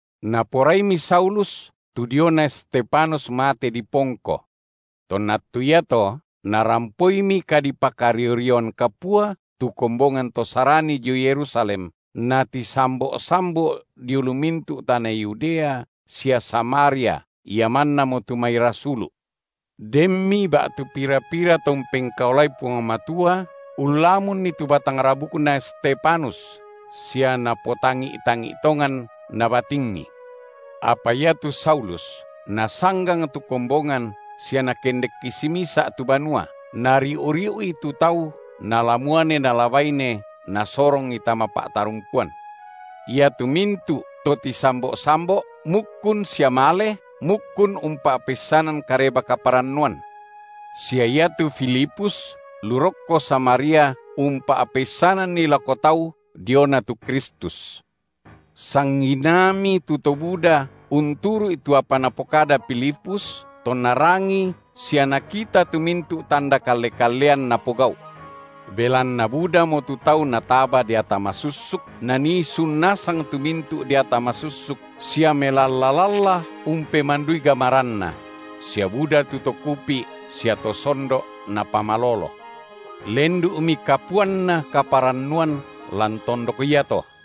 Naporaimi Saulus tu diona Stefanus mate dipongko. Tonna attu iato narampoimi kadipakario-rioan kapua tu kombongan to Sarani dio Yerusalem, natisambo’-sambo’ dio lu mintu’ tana Yudea sia Samaria, ia mannamo tu mai rasulu’. Denmi ba’tu pira-pira to umpengkaolai Puang Matua ullamunni tu batang rabukna Stefanus, sia napotangi’-tangi’ tongan nabatingi. Apa iatu Saulus nasanggang tu kombongan sia nakendekki simisa’ tu banua, nariu-riu’i tu tau nala muane nala baine, nasorongi tama pa’tarungkuan. Iatu mintu’ to tisambo’-sambo’ mukkun sia male, mukkun umpa’peissanan Kareba-kaparannuan. Sia iatu Filipus lu rokko Samaria umpa’peissananni lako tau diona tu Kristus. Sanginaami tu to buda unturu’i tu apa napokada Filipus, tonna rangii sia nakita tu mintu’ tanda kalle-kallean napogau’. Belanna budamo tu tau nataba deata masussuk, nanii sun nasang tu mintu’ deata masussuk sia melalla-lalla umpemandui gamaranna; sia buda tu to kupi’ sia to sondo’ napamalolo. Lendu’mi kapuanna kaparannuan lan tondok iato.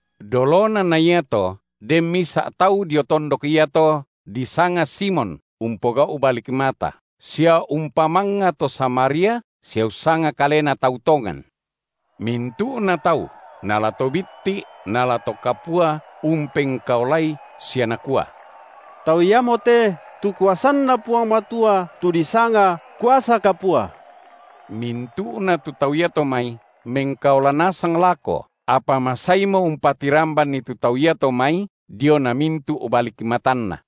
Dolona na iato den misa’ tau dio tondok iato disanga Simon umpogau’ balik mata, sia umpamangnga to Samaria, sia ussanga kalena tau tongan. Mintu’na tau nala to bitti’ nala to kapua umpengkaolai sia nakua: Tau iamote, tu kuasanNa Puang Matua, tu disanga, kuasa kapua. Mintu’na tu tau iato mai mengkaola nasang lako, apa masaimo umpatirambanni tu tau iato mai diona mintu’ balik matanna.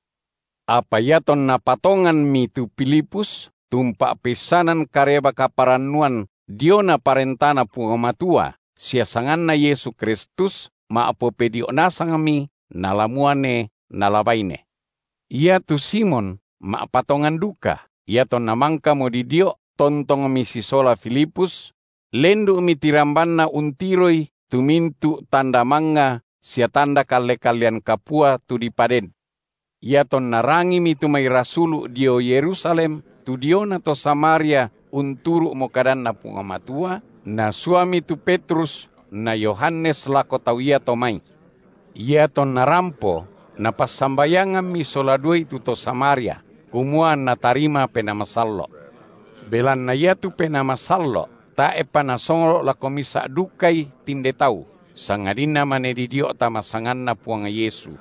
Apa iatonna patonganmi tu Filipus, tu umpa’peissanan Kareba-kaparannuan diona ParentaNa Puang Matua sia sanganNa Yesu Kristus, ma’popedio’ nasangmi nala muane nala baine. Iatu Simon ma’patongan duka, iatonna mangkamo didio’ tontongmi sisola Filipus; lendu’mi tirambanna untiroi tu mintu’ tanda mangnga sia tanda kalle-kallean kapua tu dipaden. Iatonna rangimi tu mai rasulu’ dio Yerusalem tu diona to Samaria unturu’mo kadanNa Puang Matua, nasuami tu Petrus na Yohanes lako tau iato mai. Iatonna rampo, napassambayangammi sola duai tu to Samaria, kumua anna tarima Penaa Masallo’. Belanna iatu Penaa Masallo’ tae’pa nasonglo’ lako misa’ dukai tinde tau, sangadinna mane didio’ tama sanganNa Puang Yesu.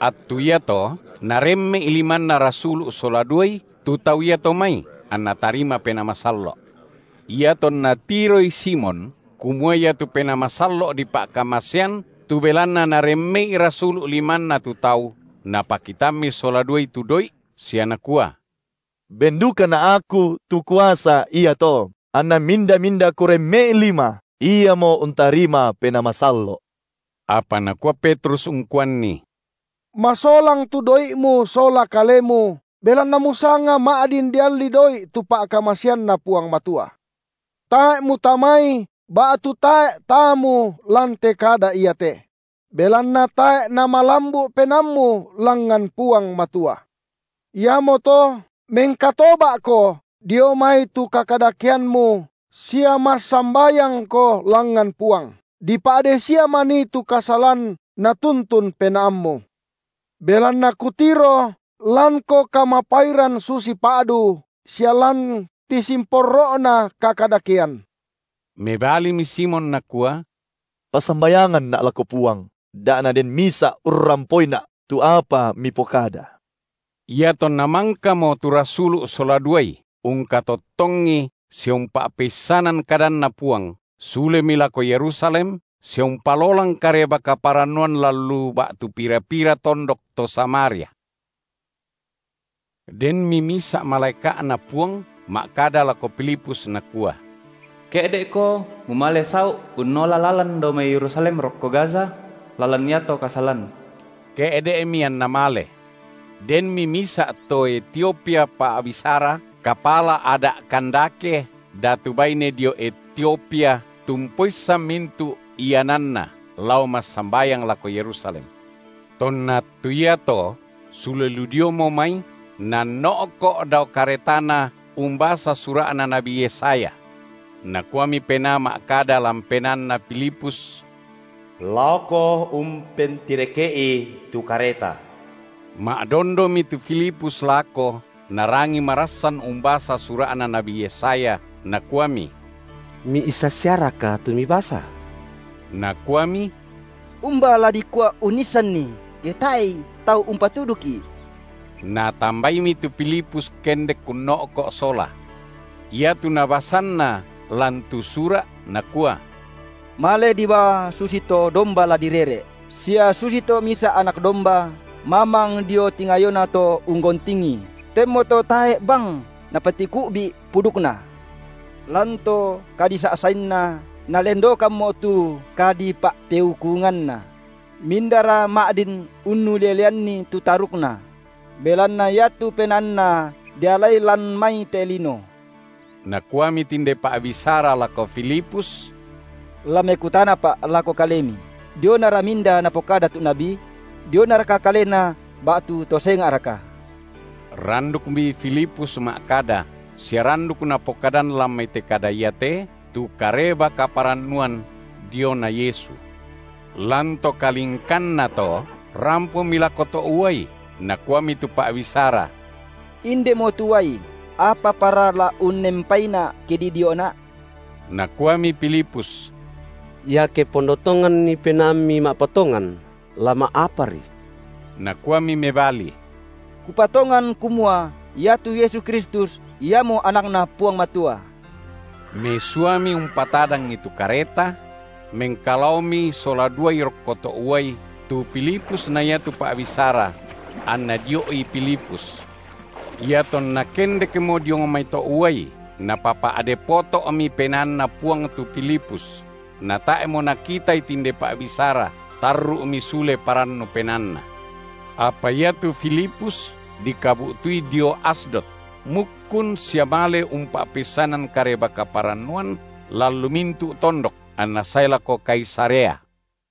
Attu iato naremme’i limanna rasulu’ sola duai tu tau iato mai, anna tarima Penaa Masallo’. Iatonna tiroi Simon, kumua iatu Penaa Masallo’ dipa’kamasean tu belanna naremme’i rasulu’ limanna tu tau, napakitammi sola duai tu doi’, sia nakua; Ben dukana’ aku tu kuasa iato, anna minda-minda kuremme’i lima, iamo untarima Penaa Masallo’. Apa nakua Petrus ungkuanni: Masolang tu doi’mu sola kalemu, belanna musanga ma’din dialli doi’ tu pa’kamasaeanNa Puang Matua. Tae’ mutamai ba’tu tae’ taamu lan te kada iate: belanna tae’ namalambu’ penaammu langngan Puang Matua. Iamoto mengkatoba’ko dio mai tu kakadakeammu, sia massambayangko langngan Puang, dipa’dei sia manii tu kasalan natuntun penaammu. Belanna kutiro lanko kamapairan susi pa’du, sia lan tisimporro’na kakadakean. Mebalimi Simon nakua: Passambayanganna’ lako Puang, da naden misa’ urrampoina’ tu apa mipokada. Iatonna mangkamo tu rasulu’ sola duai ungkatottongi sia umpa’peissanan kadanNa Puang, sulemi lako Yerusalem, sia umpalolang Kareba-kaparannuan lan lu ba’tu pira-pira tondok to Samaria. Denmi misa’ malaeka’Na Puang ma’kada lako Filipus nakua: Ke’de’ko mumale sau’ unnola lalan dao mai Yerusalem rokko Gaza; lalan iato kasalan. Ke’de’mi anna male. Denmi misa’ to Etiopia pa’bisara, kapala ada’ Kandake, datu baine dio Etiopia tu umpoissan mintu’ iananna, lao massambayang lako Yerusalem. Tonna attu iato sule lu diomo mai, nanno’ko’ dao karetana umbasa sura’na nabi Yesaya. Nakuami Penaa ma’kada lan penaanna Filipus: Laoko umpentireke’i tu kareta. Ma’dondomi tu Filipus lako narangii marassan umbasa sura’na nabi Yesaya, nakuami: Miissan siaraka tu mibasa? Nakuami: Umba la dikua unnissanni, ke tae’i tau umpatuduki’? Natambaimi tu Filipus kendek unno’ko’ sola. Iatu nabasanna lan tu Sura’ nakua: Male dibaa susito domba la direre’ sia susito misa anak domba mamang dio tingayona to unggontingi, tenmoto tae’ bang Napatiku’bi’ pudukNa. Lan to kadisa’sainNa, nalendokkammo tu kadipa’peukunganNa; mindara ma’din unnuleleanni tu tarukNa? Belanna iatu penaanNa dialai lan mai te lino. Nakuami tinde pa’bisara lako Filipus: La mekutanapa’ lako kalemi: dionara minda napokada tu nabi? dionaraka kalena ba’tu to senga’raka? Randukmi Filipus ma’kada, sia randuk napokadan lan mai te kada iate, tu Kareba-kaparannuan diona Yesu. Lan to kalingkanna to, rampomi lako to’ uai, nakuami tu pa’bisara: Indemo tu uai, apapara la unnempaina’ ke didio’na’? ( Nakuami Filipus: Iake ponno tonganni penaammi ma’patongan, la ma’apari. Nakuami mebali: Kupatongan kumua iatu Yesu Kristus Iamo AnakNa Puang Matua.) Mesuami umpatadangi tu kareta; mengkalaomi sola duai rokko to’ uai, tu Filipus na iatu pa’bisara; anna dio’i Filipus. Iatonna kendekmo diong mai to’ uai, Napapa’de poto’mi PenaanNa Puang tu Filipus, natae’mo nakitai tinde pa’bisara, tarru’mi sule parannu penaanna. Apa iatu Filipus dikabu’tui dio Asdod; mukkun sia male umpa’peissanan Kareba-kaparannuan lan lu mintu’ tondok, anna sae lako Kaisarea.